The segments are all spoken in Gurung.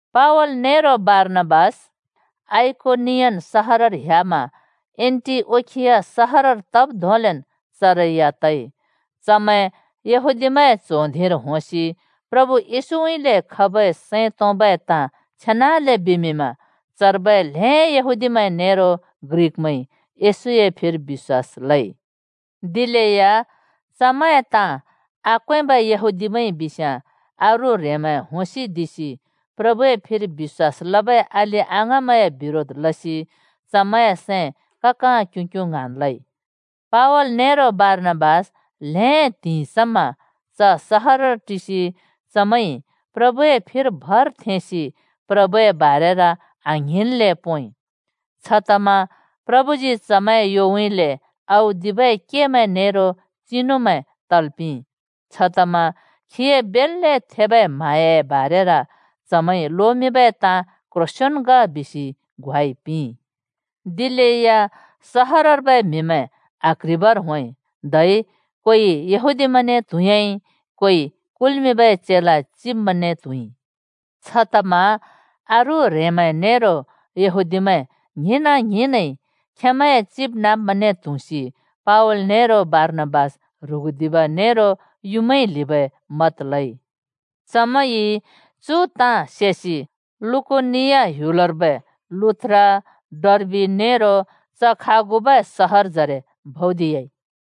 पावल नेरो बारनाबास आइकोनियन सहरर ह्‍यामा एन्‍टिओखिया सहरर तब् धोंलेन् चरै या तइ। चमैं येहूदिमैंए च्हों धिंर होंसि प्रभु येशूउँइँले खबै सैं तोंबै ताँ छेनाले बिमिंमा चर्बै ल्हें यहूदीमैं नेरो ग्रिकमैंइ येशूए फिर बिश्‍वास लइ। दिलेया चमैंए ताँ आक्वेंबै यहूदीमैंइ बिस्याँ अरू ह्रेंमैं होंसिदिसि प्रभुए फिर बिश्‍वास लबै अलि-अङाँमैंए बिरोध लसि चमैंए सैं ककाँ क्युँक्युँ ङ्हाँन् लवाइ। पावल नेरो बर्णाबास ल्‍हें त्हिंइ समा च सहरर टिसि चमैंइ प्रभुए फिर भर थेंसि प्रभुए बारेर आङ्हिंन्ले पोंइ। छतमा प्रभुजी चमैंए योउँइँले औदिबै केमैं नेरो चिनुमैं तल् पिंइ, छतमा खीए बेल्‍ले थेबै म्हाँयाए बारेर चमैंइ लोमिंबै ताँ क्‍ह्रोंसेन् ग बिसि ग्वाइ पिंइ। दिलेया सहरर्बै म्हिमैं आक्ह्रिबर होंइ, धै कोइ यहूदीमैंने त्हुँयाँइ, कोइ कुल्मिंबै चेला चिब्मैंने त्हुँइ। छतमा अरू ह्रेंमैं नेरो यहूदीमैं ङ्हिंना-ङ्हिंनइ खेंमैंए चिबनाँब्मैंने त्हुँसि पावल नेरो बारनाबास ह्रुगुदिब नेरो युँमाइ ल्हिबै मत लइ। चमैंइ चु ताँ सेसि लुकोनिया ह्‍युलर्बै सहरमैं लुस्‍त्रा, डर्बि नेरो च खागुबै क्ल्ह्‍योजरे भौदिह्‍याइ।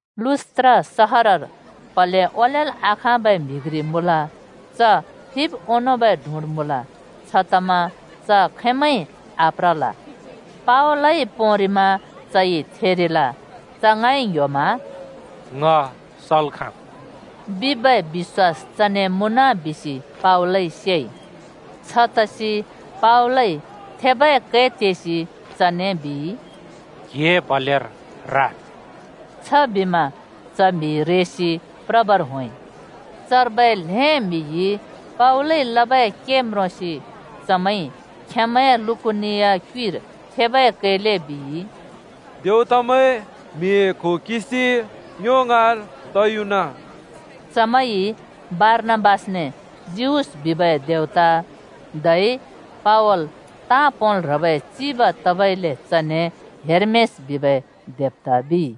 लुस्‍त्रा सहरर प्हले ओलेल् आखाँबै म्हि घ्रि मुँल। च फिब् ओंनोंबै डुँड मुँल, छतमा च खैमैंइ आप्रल। पावलइ पोंरिमा चइ थेरिल। च ङाँइ ङ्‍ह्‍योमा “ङ सल् खाँम्” बिबै बिश्‍वास चने मुँन बिसि पावलइ सेइ। छतसि पावलइ थेबै कै तेसि चने बिइ, “क्हिए प्हलेर राद्!” छबिमा च म्हि रेसि प्रबर होंइ। चर्बै ल्हें म्हिइ पावलइ लबै के म्रोंसि चमैंइ खेंमैंए लुकोनिया क्युइर थेबै कैले बिइ, “देवतामैं म्हिए क्हो किंसि ङ्यो ङाँर तयुना।” चमैंइ बारनाबासने जिउस बिबै देवता धै पावल ताँ पोंल् ह्रबै चिब तबइले चने हेर्मेस बिबै देवता बिइ।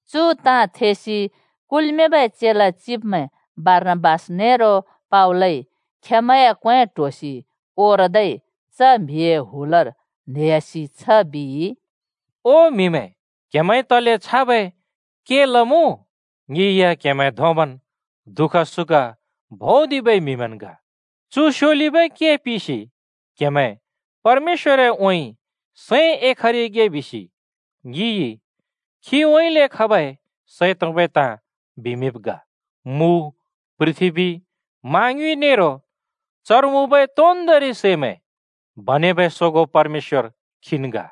चु ताँ थेसि कुल्मिंबै चेला चिब्मैं बारनाबास नेरो पावलइ खेंमैंए क्वें ट्होसि ओरदै च म्हिए हुलर न्हेयासि छ बिइ, “ओ म्हिमैं! क्‍हेमैंइ तले छाबै के लमुँ? ङि या क्हेमैं धोंबन् दुःख सुख भुँदिबै म्हिमैंन् ग। चु स्योलिबै के पिसि क्हेमैं परमेश्‍वरउँइँ सैं एखरिगे बिसि ङिइ खीउँइँले खबै सैं तोंबै ताँ बिमिंब् ग। मु, पृथ्‍बी, मा ङ्युँइ नेरो चर मुँबै तोन्दोंरि सैमैं बनेबै सोगों परमेश्‍वर खीन् ग।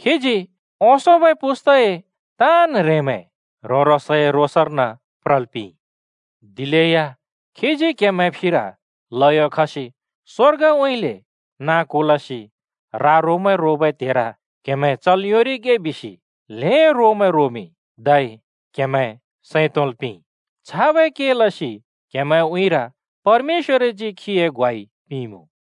खीजी ओंसोंबै पुस्तए ताँन् ह्रेंमैं ह्रों-ह्रोंसए रोसर्न प्रल् पिंइ। दिलेया खीजी क्हेमैंए फिर ल्हयो खसि स्वर्गउँइँले नाँ कुलसि रा-रोमैं रोबै त्हेर क्हेमैं चल् योंरिगे बिसि ल्हें रोमैं रोमिंइ धै क्हेमैं सैं तोंल् पिंइ। छाबै के लसि क्हेमैंए उँइँर परमेश्‍वरजी खीए ग्वाइ पिंइँमुँ।”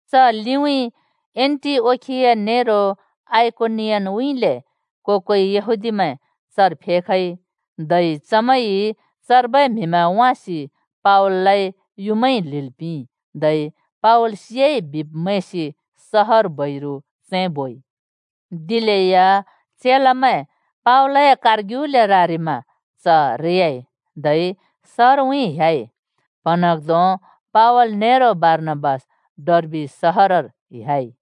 च लिउँइँ एन्‍टिओखिया नेरो आइकोनियनउँइँले को-कोइ यहूदीमैं चर फेखइ, धै चमैंइ चर्बै म्हिमैं वाँसि पावललाइ युँमाइ ल्हिल् पिंइ, धै पावल सियाइ बिब् मैंसि सहर बैरु चैं बोइ। दिलेया चेलामैं पावलए कारग्युले रारिमा च रेयाइ, धै सहरउँइँ ह्‍याइ। प्हँन्हाँग्धों पावल नेरो बारनाबास डर्बि सहरर ह्‍याइ।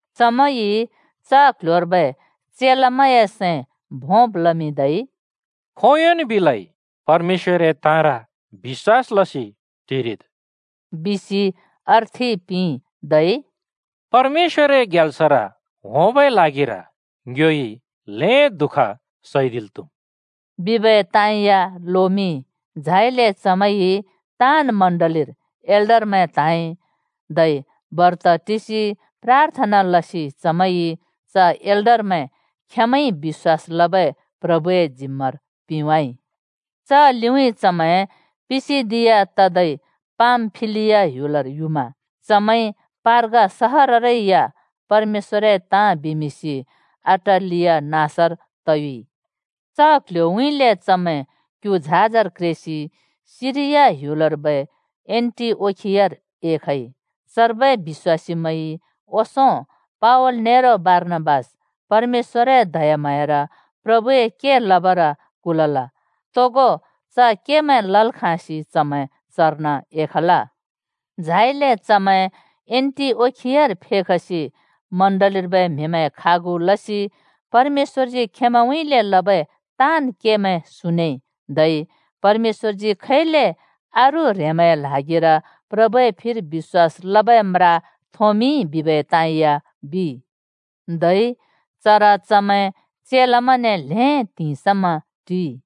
चमैंइ च क्ल्ह्‍योर्बै चेलामैंए सैं भोंब् लमिंदै “खोंयोंन् बिलै परमेश्‍वरए ताँर बिश्‍वास लसि टिरिद्,” बिसि अर्थि पिंइ, धै “परमेश्‍वरए ग्याल्सर होंबै ल्हागिर ङ्योइ ल्हें दुःख सैदिल् त्हुम्,” बिबै ताँ या लोमिंइ। झाइले चमैंइ ताँन् चर्चर एल्डरमैं त्हाँइ, धै बर्त टिसि प्राथना लसि चमैंइ च एल्डरमैं खेंमैंइ बिश्‍वास लबै प्रभुए जिम्मार पिंवाइ। च लिउँइँ चमैं पिसिदिया तदै पामफिलिया ह्‍युलर युमा चमैंइ पर्गा सहररै या परमेश्‍वरए ताँ बिमिंसि अटालिया नाँसर तयुइ। च क्ल्ह्‍योउँइँले चमैं क्यु झाजर क्रेसि सिरिया ह्‍युलर्बै एन्‍टिओखियार एखइ। चर्बै बिश्‍वासीमैंइ ओंसों पावल नेरो बारनाबास परमेश्‍वरए दयाम्हाँयार प्रभुए के लबर कुलल। तोगो च केमैं लल् खाँसि चमैं चर्न एखल। झाइले चमैं एन्‍टिओखियार फेखसि चर्चर्बै म्हिमैं खागु लसि परमेश्‍वरजी खेंमैंउँइँले लबै ताँन् केमैं सुनेइ, धै परमेश्‍वरजी खैले अरू ह्रेंमैंए ल्हागिर प्रभुए फिर बिश्‍वास लबै म्रा थोंमिंइ बिबै ताँ या बिइ। धै चर चमैं चेलामैंने ल्हें त्हिंइ समा टिइ।